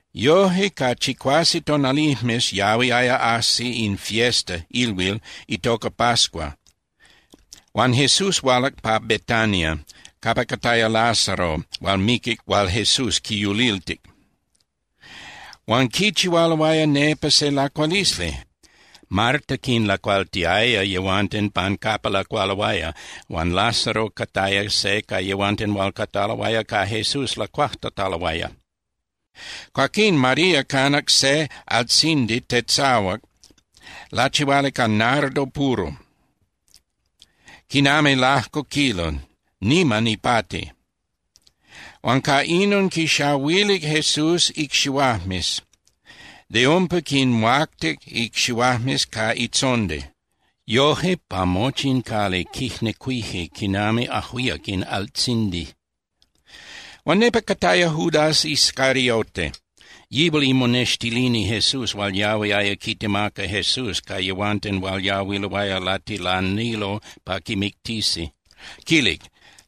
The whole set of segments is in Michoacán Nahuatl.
Yoje, ca chicuase tonalijmes yahuiaya ajsi in fiesta (ilhuil) itoca pascua, huan Jesús hualac pa Betania capa cataya Lázaro hual miquic hual Jesús quiyuliltic. Huan quichihualoaya nepa se lacualisli. Marta quinlacualtiaya yehuanten pan capa lacualoaya, huan Lázaro cataya se ca yehuanten hual cataloaya ca Jesús lacuajtataloaya. Cuaquín María canac se altzindi tetzahuac lachihuali ca nardo puro, quinami lajco kilo, niman ipati. Huan ca inon quixahuilic Jesús icxihuajmes, de umpa quinhuactic icxihuajmes ca itzondi. Yoje, pa mochi in cali quijnecuije quinami ajuíac in altzindi. Huan nepa cataya Judas Iscariote. Yihual imonextilini Jesús hual yahuiaya quitemaca Jesús ca yehuanten hual yahuiloaya latilanilo pa quimictisi. Quilic: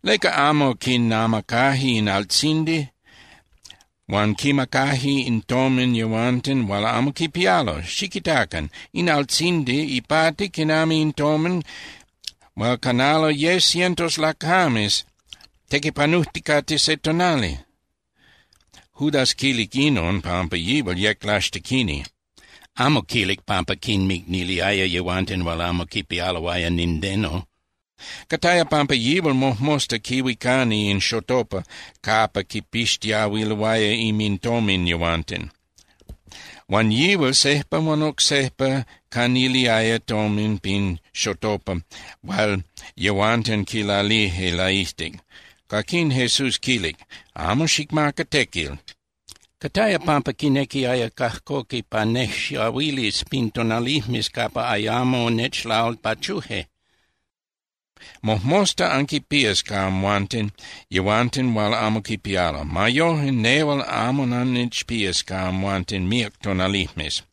—¿Leca amo quinamacaje in altzindi huan quinmacaje in tomin yehuanten hual amo quipialo? Xiquitacan. In altzindi ipati quinami in tomin hual canalo ye cientos lacames tequipanujticate se tonali. Judas quilic inon pampa yihual yec laxtequini. Amo quilic pampa quinmicniliaya yehuanten hual amo quipialoaya nindeno. Cataya pampa yihual mojmosta quihuicani in xotopa capa quipixtiahuiloaya inmintomin yehuanten. Huan yihual sejpa huan oc sejpa caniliaya tomin pin xotopa hual yehuanten quilalilije laijtic. Cuaquín Jesús quilic: —Amo xicmaca tequil. Cataya pampa quinequiaya cajcoqui pa nejxahuilis pin tonalijmes capa ayamo nechlalpachuje. Mojmosta anquinpías ca amhuanten yehuanten hual amo quipialo. Ma yoje, nehual amo annechpías ca amhuanten míac tonalijmes.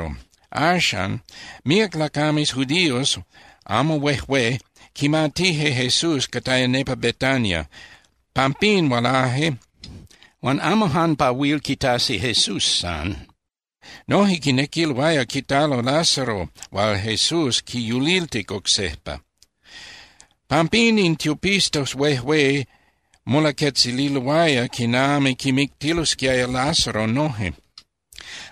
Axan, míac lacames judíos amo huejué quimatije Jesús cataya nepa Betania. Pampín hualaje, huan amo jan pa huil quitasi Jesús san. Noje quinequiloaya quitalo Lázaro hual Jesús quiyuliltic oc sejpa. Pampín, in tiopistas huejué molaquetzililoaya quinami quimictilosquiaya Lázaro noje.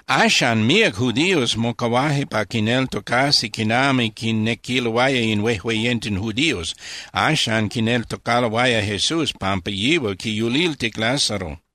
Axan míac judíos mocahuaje pa quinneltocasi quinami quinequiloaya in huejueyenten judíos. Axan quineltocaloaya Jesús pampa yihual quiyuliltic Lázaro.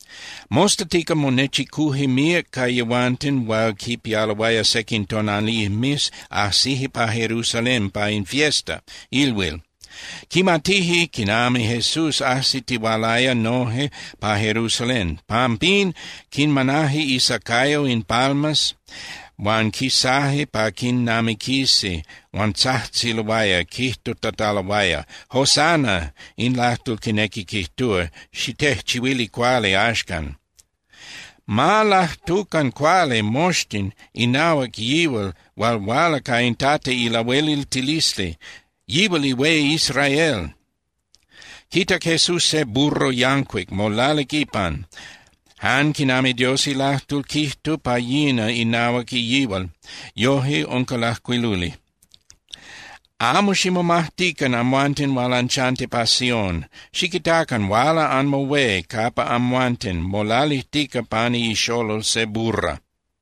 Mostatica monechicuje míac ca yehuanten hual quipialoaya sequin tonalijmes ajsije pa Jerusalén pa in fiesta (ilhuil). Quimatije quinami Jesús ajsitihualaya noje pa Jerusalén. Pampín quinmanaje isacayo in palmas huan quisaje pa quinamiquisi, huan tzajtziloaya, quijtutataloaya: —¡Hosana! (In lajtol quinequi quijtúa: “¡Xitejchihuili cuali axcan!”) ¡Ma lajtucan cuali moxtin inahuac yihual hual huala ca in Tata ilahueliltilisli! ¡Yihual ihué Israel! Quitac Jesús se burro yancuic, molalic ipan, jan quinami Dios ilajtol quijtuc pa yina inahuac yihual, yoje unca lajcuiluli: Amo ximomajtican amhuanten hual anchanti pa Sión. Xiquitacan, huala anmohué capa amhuanten, molalijtica pani ixolol se burra.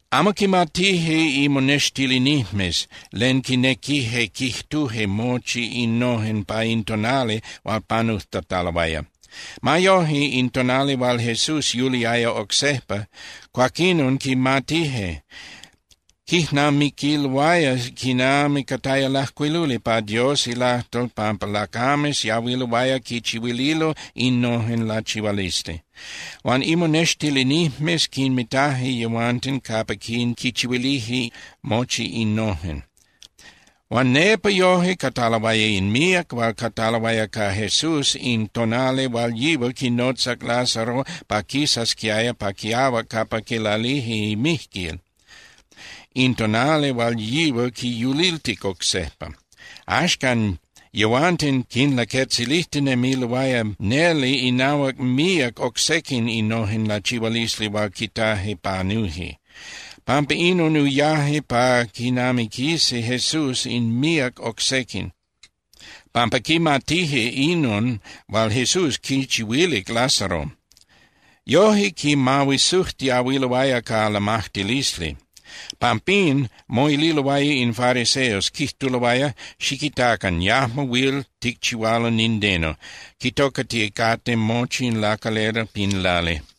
Amo quimatije imonextilinijmes len quinequije quijtuje mochi innojen pa in tonali hual panujtataloaya. Ma yoje, in tonali hual Jesús yuliaya oc sejpa, cuaquinon quimatije. Quijnamiquiloaya quinami cataya lajcuiluli pa Dios ilajtol pampa lacames yahuiloaya quichihuililo innojen lachihualisli. Huan imonextilinijmes quinmitaje yehuanten capa quichihuilije mochi innojen. Huan nepa noje cataloaya in míac hual cataloaya ca Jesús in tonali hual yihual quinotzac Lázaro pa quisasquiaya pa quiahuac capa quilalije imijquil, in tonali hual yihual quiyuliltic oc sejpa. Axcan yehuanten quinlaquetzilijtinemiloaya neli inahuac míac oc sequin innojen lachihualisli hual quitaje panuje. Pampa inon uyaje pa quinamiquisi Jesús in míac oc sequin, pampa quimatije inon hual Jesús quichihuilic Lázaro. Yoje quimahuisujtiahuiloaya ca lamajtilisli. Pampín, moililoaya in fariseos, quijtuloaya: —Xiquitacan. Yajmo huil ticchihualo nindeno. Quitocaticate moxtin in lacalera pin lali.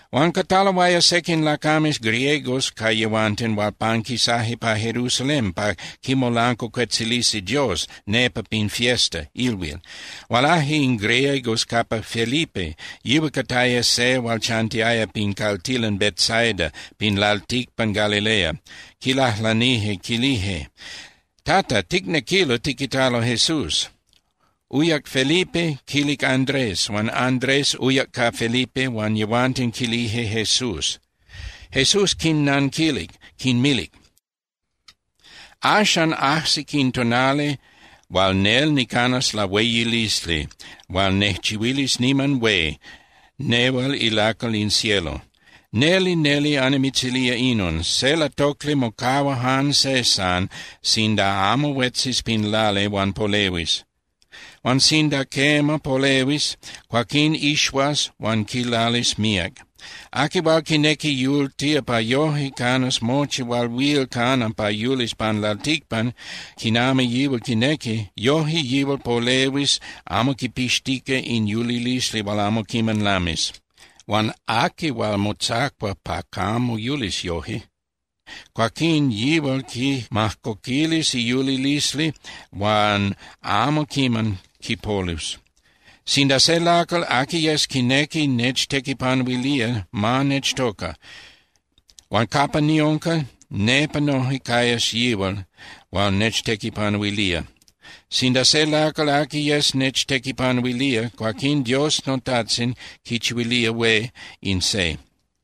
Huan cataloaya sequin lacames griegos ca yehuanten hual panquisaje pa Jerusalén pa quimolancuacuetzilisi Dios nepa pin fiesta (ilhuil). Hualaje in griegos capa Felipe, yihual cataya se hual chantiaya pin caltilan Betsaida pin lalticpan Galilea. Quilajlanije quilije: —Tata, ticnequilo tiquitalo Jesús. Uyac Felipe, quilic Andrés, huan Andrés uyac ca Felipe huan yehuanten quilije Jesús. Jesús quinnanquilic, quinmilic: —Axan ajsic in tonali hual nel nicanas lahueyilisli hual nejchihuilis niman hué nehual ilacal in cielo. Neli, neli annimitzilía inon: Se latocli mocahua jan se san sinda amo huetzis pin lali huan polehuis. Huan sinda quema polehuis, cuaquín ixuas huan quilalis míac. Aqui hual quinequi yultía pa yoje canas mochi hual huil cana pa yulis pan lalticpan quinami yihual quinequi, yoje yihual polehuis amo quipixtica in yulilisli hual amo quiman lamis. Huan aqui hual motzacua pa camo yulis yoje, cuaquín yihual quimajcoquilis iyulilisli huan amo quiman quipolus. Sinda se lacal, aqui yes, quinequi nechtequipanuilía, ma nechtoca. Huan capa niunca, nepa noje cayas yihual hual nechtequipanuilía. Sinda se lacal aqui yes nechtequipanuilía, cuaquín Dios noTajtzin quichihuilía hué in se.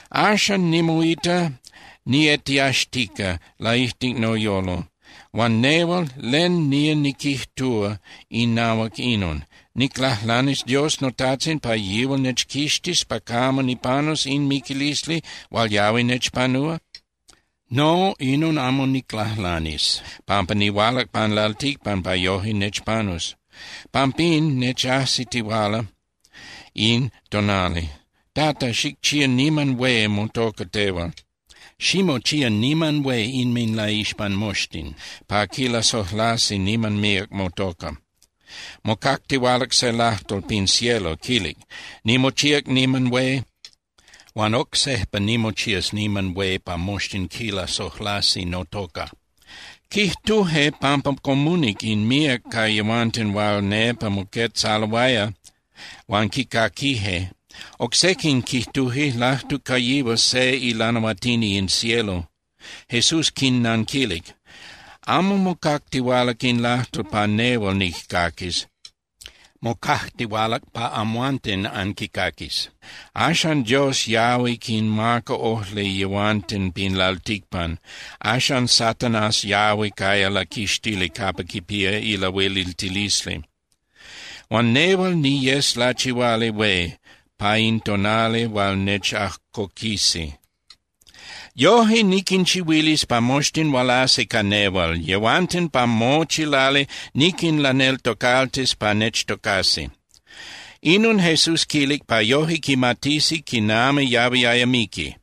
’Axan nimoita nietiaxtica laijtic noyolo, huan nehual, ¿len nía niquijtúa inahuac inon? ¿Niclajlanis Dios noTajtzin pa yihual nechquixtis pa camo nipanus in miquilisli hual yahui nechpanúa? No, inon amo niclajlanis, pampa nihualac pan lalticpan pa yoje nechpanus, pampín nechajsitihuala in tonali. Tata, xicchía niman hué motoca tehual. Ximochía niman hué inminlaixpan moxtin, pa quilasojlasi niman míac motoca. Mocactihualac se lajtol pin cielo, quilic: —Nimochíac niman hué, huan oc sejpa nimochías niman hué pa moxtin quilasojlasi notoca. Quijtuje pampa comunic in míac ca yehuanten hual nepa moquetzaloaya huan quicaquije. Oc sequin quijtuje: —Lajtuc ca yihual se ilanahuatini in cielo. Jesús quinnanquilic: —Amo mocactihualac in lajtol pa nehual nijcaquis. Mocactihualac pa amhuanten anquicaquis. Axan Dios yahui quinmaca ojli yehuanten pin lalticpan, axan Satanás yahui caya laquixtili capa quipía ilahueliltilisli. Huan nehual niyes lachihuali hué pa in tonali hual nechajcoquisi. Yoje niquinchihuilis pa moxtin hualasi ca nehual, yehuanten pa mochi lali niquinlaneltocaltis pa nechtocasi. Inon Jesús quilic, pa yoje quimatisi quinami yahuiaya miqui.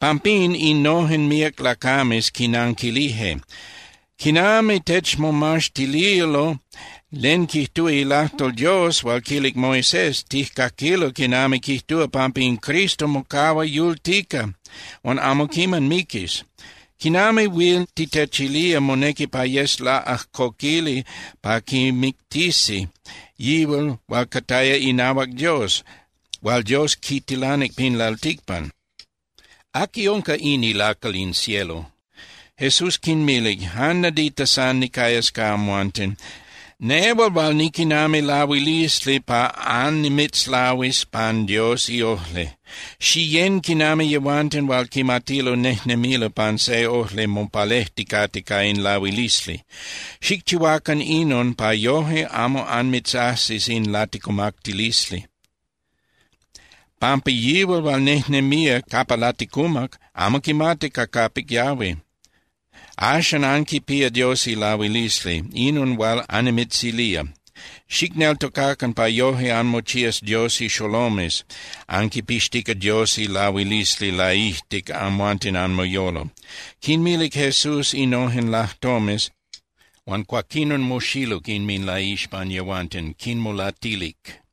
Pampín, innojen míac lacames quinanquilije: —Quinami techmomaxtililo len quijtúa ilajtol Dios hual quilic Moisés, tijcaquilo quinami quijtúa pampa in Cristo mocahua yultica huan amo quiman miquis. ¿Quinami huil titechilía monequi pa yes laꞌajcoquili pa quimictisi yihual hual cataya inahuac Dios, hual Dios quitilanic pin lalticpan? ¿Aqui unca in ilacal in cielo? Jesús quinmilic: —Jan nadita san nicayas ca amhuanten, nehual hual niquinami lahuilisli pa annimitzlahuis pan Dios iojli. Xiyén quinami yehuanten hual quimatilo nejnemilo pan se ojli mopalejticate ca in lahuilisli. Xicchihuacan inon pa yoje amo anmitzajsis in laticumactilisli. Pampa yihual hual nejnemía capa laticumac amo quimati ca capic yahui. Axan anquipía Dios ilahuilisli, inon hual annimitzilía. Xicneltocacan, pa yoje anmochías Dios ixolomes anquipixtica Dios ilahuilisli laijtic amhuanten anmoyolo. Quinmilic Jesús innojen lajtomes, huan cuaquinon moxiluc inminlaixpan yehuanten, quinmolatilic.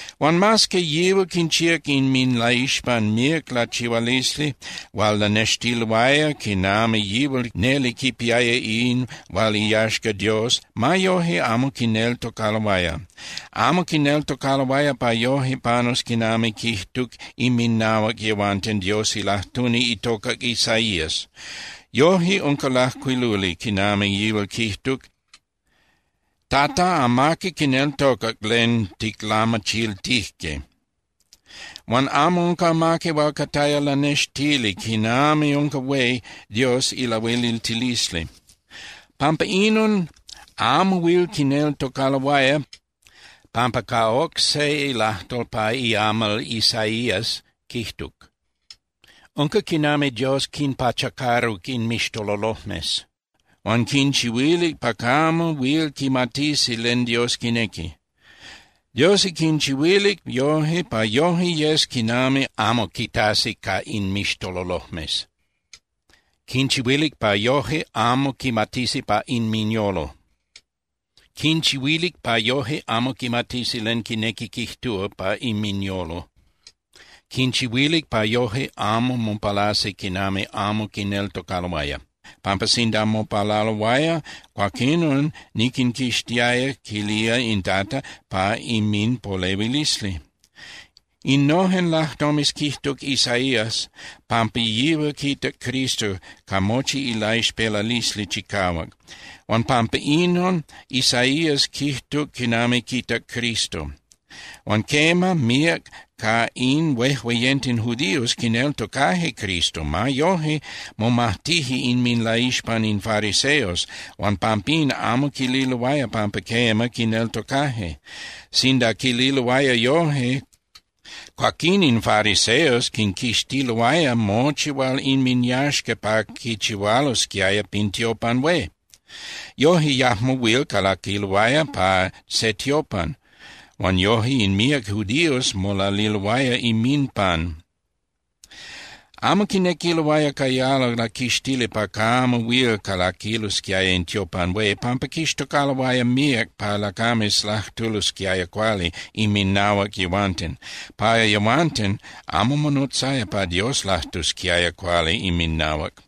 Huan mas que yihual quinchíac inminlaixpan míac lachihualisli hual lanextiloaya quinami yihual neli quipiaya in hual iyaxca Dios, ma yoje amo quineltocaloaya. Amo quineltocaloaya pa yoje panus quinami quijtuc inminahuac yehuanten Dios ilajtuni itocac Isaías. Yoje unca lajcuiluli quinami yihual quijtuc: Tata, amaqui quineltocac len ticlamachiltijque. Huan amo unca amaqui hual cataya lanextili quinami unca hué Dios ilahueliltilisli. Pampa inon amo huil quineltocaloaya, pampa ca oc se lajtol pa iamal Isaías quijtuc: Unca quinami Dios quinpachacaruc inmixtololojmes huan quinchihuilic pa camo huil quimatisi len Dios quinequi. Dios quinchihuilic yoje pa yoje yes quinami amo quitasi ca inmixtololojmes, quinchihuilic pa yoje amo quimatisi pa inminyolo, quinchihuilic pa yoje amo quimatisi len quinequi quijtúa pa inminyolo, quinchihuilic pa yoje amo mopalasi quinami amo quineltocaloaya, pampa sinda mopalaloaya, cuaquinon niquinquixtiaya, quilía in Tata, pa inminpolehuilisli. Innojen lajtomes quijtuc Isaías pampa yihual quitac Cristo ca mochi ilaixpelalisli chicahuac, huan pampa inon Isaías quijtuc quinami quitac Cristo. Huan quema, míac ca in huejueyenten judios quineltocaje Cristo. Ma yoje, momajtije inminlaixpan in fariseos, huan pampín amo quililoaya pampa quema, quineltocaje. Sinda quililoaya yoje, cuaquín in fariseos quinquixtiloaya mochi hual inminyaxca pa quichihualosquiaya pin tiopan hué. Yoje yajmo huil calaquiloaya pa se tiopan, huan yoje in míac judíos molaliloaya inminpan. Amo quinequiloaya cayalo laquixtili pa camo huil calaquilosquiaya in tiopan hué, pampa quixtocaloaya míac pa lacames lajtulosquiaya cuali inminahuac yehuanten. Pa yehuanten, amo monotzaya pa Dios lajtusquiaya cuali inminahuac.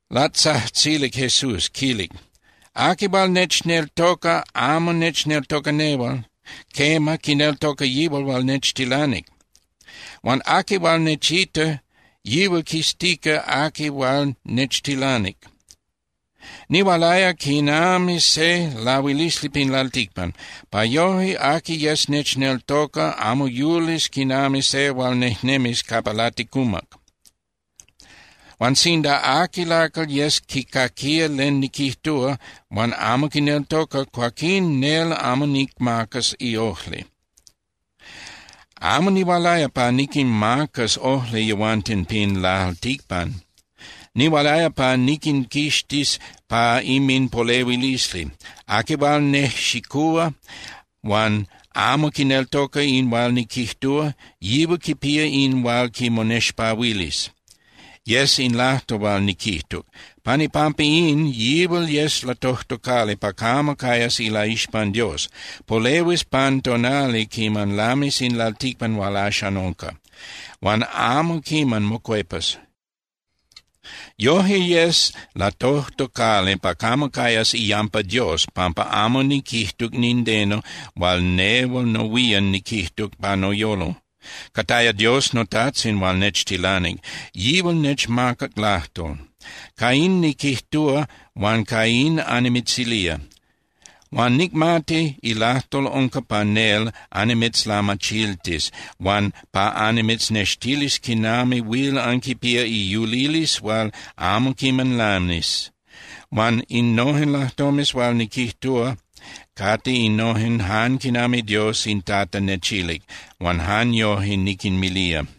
Latzajtzilic Jesús, quilic: —Aqui hual nechneltoca amo nechneltoca nehual. Quema, quineltoca yihual hual nechtilanic. Huan aqui hual nechita, yihual quiztica aqui hual nechtilanic. Nihualaya quinami se lahuilisli pin lalticpan, pa yoje aqui yes nechneltoca amo yulis quinami se hual nejnemía capa laticumac. Huan sinda aqui lacal yes quicaquía len niquijtúa, huan amo quineltoca, cuaquín nel amo nicmacas iojli. Amo nihualaya pa niquinmacas ojli yehuanten pin lalticpan. Nihualaya pa niquinquixtis pa inminpolehuilisli. Aqui hual nejxicúa huan amo quineltoca in hual niquijtúa, yihual quipía in hual quimotexpahuilis. Yes in lajtol hual niquijtuc. Pan ipampa in, yihual yes latojtocali pa camo cayas ilaixpan Dios. Polehuis pan tonali quiman lamis in lalticpan hual axan unca, huan amo quiman mocuepas. Yoje yes latojtocali pa camo cayas iyampa Dios pampa amo niquijtuc nindeno hual nehual nohuían niquijtuc pa noyolo. Cataya Dios noTajtzin hual nechtilanic, yihual nechmacac lajtol. Ca in niquijtúa huan ca in annimitzilía. Huan nicmati ilajtol unca pa nel annimitzlamachiltis huan pa annimitznextilis quinami huil anquipía iyulilisli hual amo quiman lamis. Huan innojen lajtomes hual niquijtúa cate innojen jan quinami Dios in Tata nechilic, huan jan yoje niquinmilía.